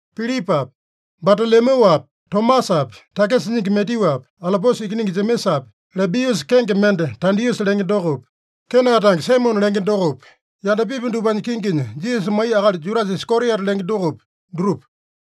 Pilipapi, Batalomyuapi, Tomasapi, takisa nyingi Matyuapi, Alopiusa ikiningi Jemesapi, Lebiusa kenge mende Tadiusa lenge dokopi, Kena tange Saimone lenge dokopi, yandapipi dupanya kinginya Jisasa maiya akali Judasa Iskariota lenge dokopi, dutupa.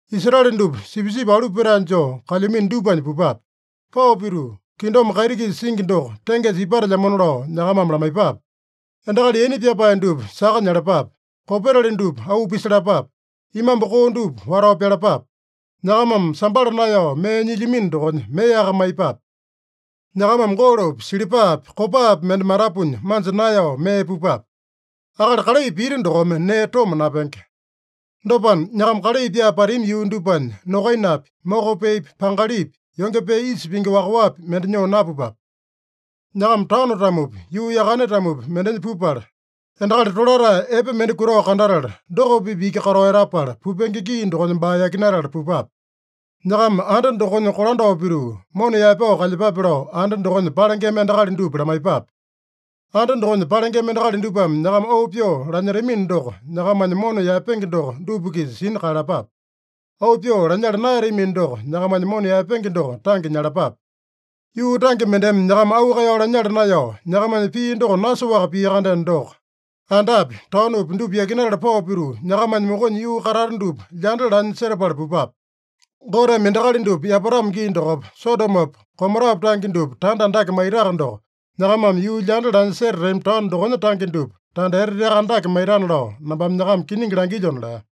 Israele dupa sipisipi alu petae joo kalyamino dupanya pupape. Pao pituu, ‘Kingdom kaiti-kisa singi doko tengesa ipatelyamona’ lao nyakamame lamaiyepape. Endakali yaina pyapae dupa saka nyalapape. Kopetali dupa auu pisalapape. Imambu koo dupa watao pyalapape. Nyakamame sambala naeyao mee nyilyamino dokonya meaka maiyepape. Nyakamame golopi, silipapi, kopapi mende matapunya manja naeyao mee pupape. Akali kalai pita dokome nee toma napenge. Dopana, nyakama kalai pyaa patami yuu dupanya, nokainapi, moko peepi, pangalipi, yonge pee isa pingi wakaowapi mende nyoo napupape. Nyakama taono-tamopi, yuu yakane-tamopi mendenya pupala, endakali tolatae epe mende kutao kandatala, doko-pipa iki katao etapala, pupenge gii dokonya baa yakinatala pupape. Nyakama anda dokonya kolandao pituu, mona yaepao kalyepape lao, anda dokonya palengema endakali dupa lamaiyepape. Anda dokonya palengema endakali dupame nyakama auu pyoo lanyetamino doko, nyakamanya mona yaepenge doko dupa-kisa sina kaeyalapape. Auu pyoo lanyala naeyatamino doko, nyakamanya mona yaepenge doko tange nyalapape. Yuu tange mendeme nyakama auu kaeyao lanyala naeyao, nyakamanya pii doko nasoaka pia-kandeno doko, andapi, taonopi dupa yakinatala pao pituu, nyakamanya mokonya yuu katata dupa lyanda lanya setapala pupape. Goteme endakali dupa yapatamo gii dokopa Sodomopa, Gomorapa tange dupa tanda andake maitaka doko, nyakamame yuu lyanda lanya setatami taono dokonya tange dupa tanda eteteaka andake maitana lao nambame nyakama kiningi langilyona” lea.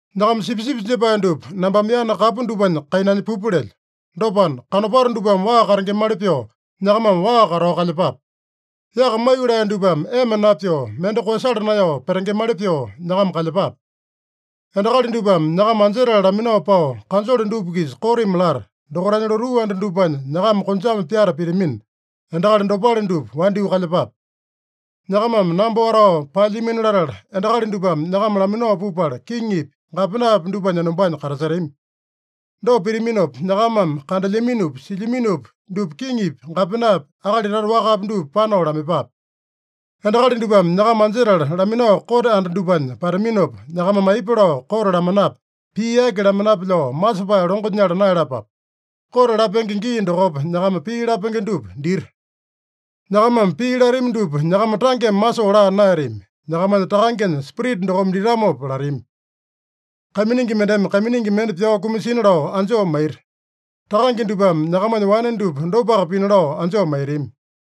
“Nyakama sipisipi jepae dupa nambame yana kapu dupanya kainanya pupa lelyo. Dopana, kanopato dupame waa katengemali pyoo, nyakamame waa katao kalyepape. Yaka maiyolee dupame ema napyoo, mende koeyasala naeyao petengemali pyoo nyakama kalyepape. Endakali dupame nyakama anjetala laminao pao, kanjole dupa-kisa kotimi lata, dokaitanya lotuu anda dupanya nyakama konjame pyata pitamina, endakali dopale dupa wandyoo kalyepape. Nyakamame namba watao paelyamino latala, endakali dupame nyakama laminao pupala kiŋipi, gapenapi dupanya enombanya katasetami. Dopa pitaminopa, nyakamame kandelyaminopi, silyaminopi dupa kiŋipi, gapenapi, akali tata wakapi dupa panao lamaiyepape. Endakali dupame nyakama anjetala laminao kote anda dupanya pataminopa, nyakamame aipa lao kote lamanape, pii aki lamanape lao masepae longo nyala naeyalapape. Kote lapenge gii dokopa nyakama pii lapenge dupa dita. Nyakamame pii latami dupa, nyakama tangeme masoo laa naeyatami. Nyakamanya Takangenya Spirita dokome ditamopa latami. Kaiminingi mendeme kaiminingi mende pyao kumasina lao anjoo maita. Takange dupame nyakamanya wane dupa dopaka pina lao anjoo maitami.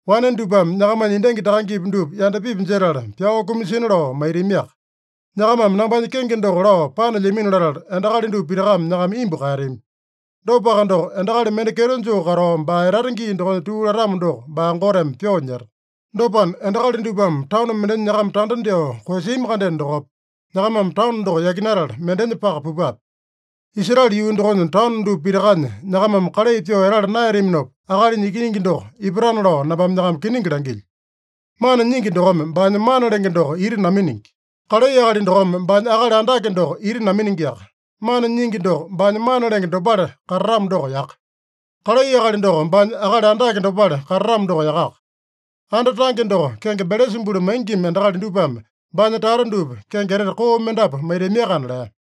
Wane dupame nyakamanya endangi takangepi dupa yandapipi jetala, pyao kumasina lao maitamiaka. Nyakamame nambanya kenge doko lao panelyamino latala, endakali dupa pitakame nyakama imbu kaeyatami. Dopaka doko, endakali mende kyeto joo katao, baa etata gii dokonya tuu latamo doko, baa Goteme pyoo nyeta. Dopana, endakali dupame taono mendenya nyakama tanda dyoo koeyasiami-kandeno dokopa, nyakamame taono doko yakinatala mendenya paka pupape. Israele yuu dokonya taono dupa pitakanya nyakamame kalai pyoo etala naeyataminopa, Akalinya Ikiningi doko ipatana lao nambame nyakama kiningi langilyo. “Mana nyingi dokome baanya mana lenge doko ita naminingi. Kalai akali dokome baanya akali andake doko ita naminingiaka. Mana nyingi doko baanya mana lenge dopale katatamo doko yaka. Kalai akali doko baanya akali andake dopale katatamo doko yakaka. Anda tange doko kenge Belesabulu maingima endakali dupame baanya tata dupa kenge etete koo mendapu maitamiakana” lea.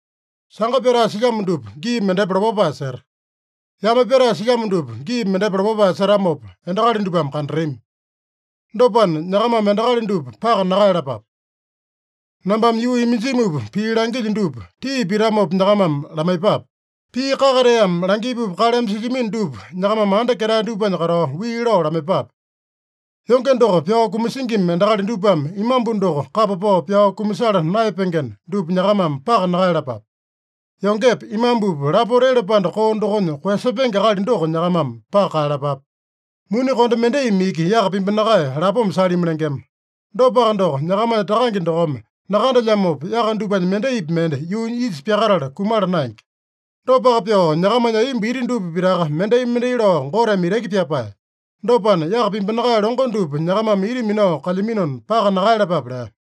“Sanga pyatae silyamo dupa gii mendepa lopapae seta. Yame pyatae silyamo dupa gii mendepa lopapae setamopa, endakali dupame kandatami. Dopana, nyakamame endakali dupa paka nakaeyalapape. Nambame yuu iminjimupa pii langilyo dupa, tii pitamopa nyakamame lamaiyepape. Pii kakateame langipupa kaleme silyamino dupa, nyakamame anda ketae dupanya katao wii lao lamaiyepape. Yonge doko pyao kumasingima endakali dupame imambu doko kapa pao pyao kumasala naeyapengena, dupa nyakamame paka nakaeyalapape. Yongepa, imambupa lapota ele panda koo dokonya koeyasepenge akali doko nyakamame paka kaeyalapape. Muni konde mendaimi iki yaka pimbinakae lapoma salimi lengema. Dopaka doko, nyakamanya Takange dokome nakandelyamopa, yaka dupanya mendaipi mende yuunya isa pyakatala kumala naenge. Dopaka pyoo, nyakamanya aiyomba iti dupa pitaka mendai-mendai lao Goteme itaki pyapae. Dopana, yaka pimbinakae longo dupa nyakamame ita minao kalyaminona, paka nakaeyalapape” lea.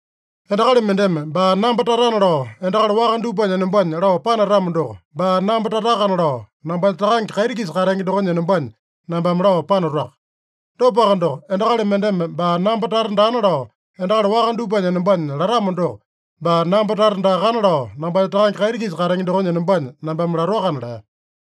“Endakali mendeme baa namba tatana lao, endakali waka dupanya enombanya lao panatamo doko, baa namba tatakana lao, nambanya Takange kaiti-kisa katenge dokonya enombanya nambame lao panatoaka. Dopaka doko, endakali mendeme baa namba tata daana lao, endakali waka dupanya enombanya latamo doko, baa namba tata daakana lao, nambanya Takange kaiti-kisa katenge dokonya enombanya nambame latoakana” lea.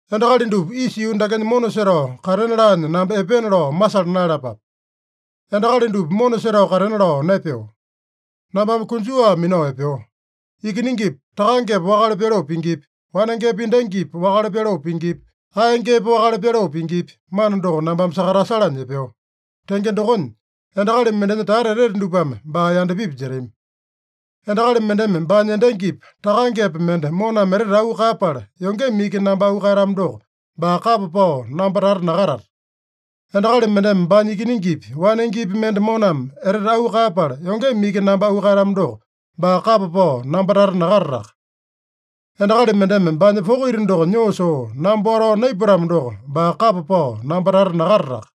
“Endakali dupa isa yuu dakenya mona setao katena laanya namba epeena lao masala naeyalapape. Endakali dupa mona setao katena lao naepeo. Nambame konjuwa minao epeo. Ikiningipa takangepa wakale pyaloo pingipi, wanengepa endangipa wakale pyaloo pingipi, aeyangepa wakale pyaloo pingipi, mana doko nambame sakatasalanya epeo. Tenge dokonya, endakali mendenya tata etete dupame baa yandapipi jetami. Endakali mendeme baanya endangipa, takangepa mende moname etete auu kaeyapala, yongeme iki namba auu kaeyatamo doko, baa kapa pao namba tata nakatata. Endakali mendeme baanya ikiningipi, wanengepi mende moname etete auu kaeyapala, yongeme iki namba auu kaeyatamo doko, baa kapa pao namba tata nakatataka. Endakali mendeme baanya poko ita doko nyoo soo, namba watao naipatamo doko, baa kapa pao namba tata nakatataka.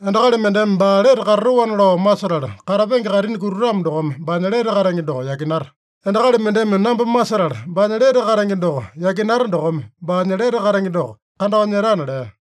Endakali mendeme baa lete katatoana lao masetala katapenge kaitini kutatamo dokome baanya lete katenge doko yakinata. Endakali mendeme namba masetala, baanya lete katenge doko yakinata dokome baanya lete katenge doko kandao nyetana” lea.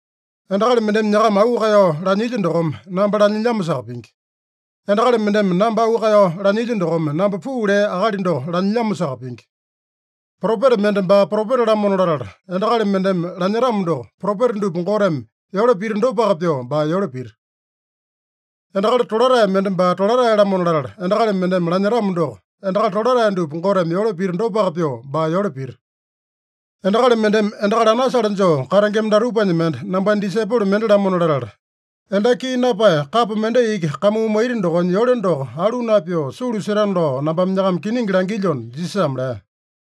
“Endakali mendeme nyakama auu kaeyao lanyilya dokome, namba lanyilyamosaka pingi. Endakali mendeme namba auu kaeyao lanyilya dokome, namba puu lea Akali doko lanyilyamosaka pingi. Propeta mende baa propeta-lamona latala endakali mendeme lanyetamo doko, propeta dupa Goteme yole pita dopaka pyoo baa yole pita. Endakali tolatae mende baa tolatae-lamona latala endakali mendeme lanyetamo doko, endakali tolatae dupa Goteme yole pita dopaka pyoo baa yole pita. Endakali mendeme endakali anasale joo katengema datupanya mende nambanya disaipolo mende-lamona latala, endaki kii napae kapo mendai iki kamuu maita dokonya yole doko alu napyoo, sulu setana lao nambame nyakama kiningi langilyona” Jisasame lea.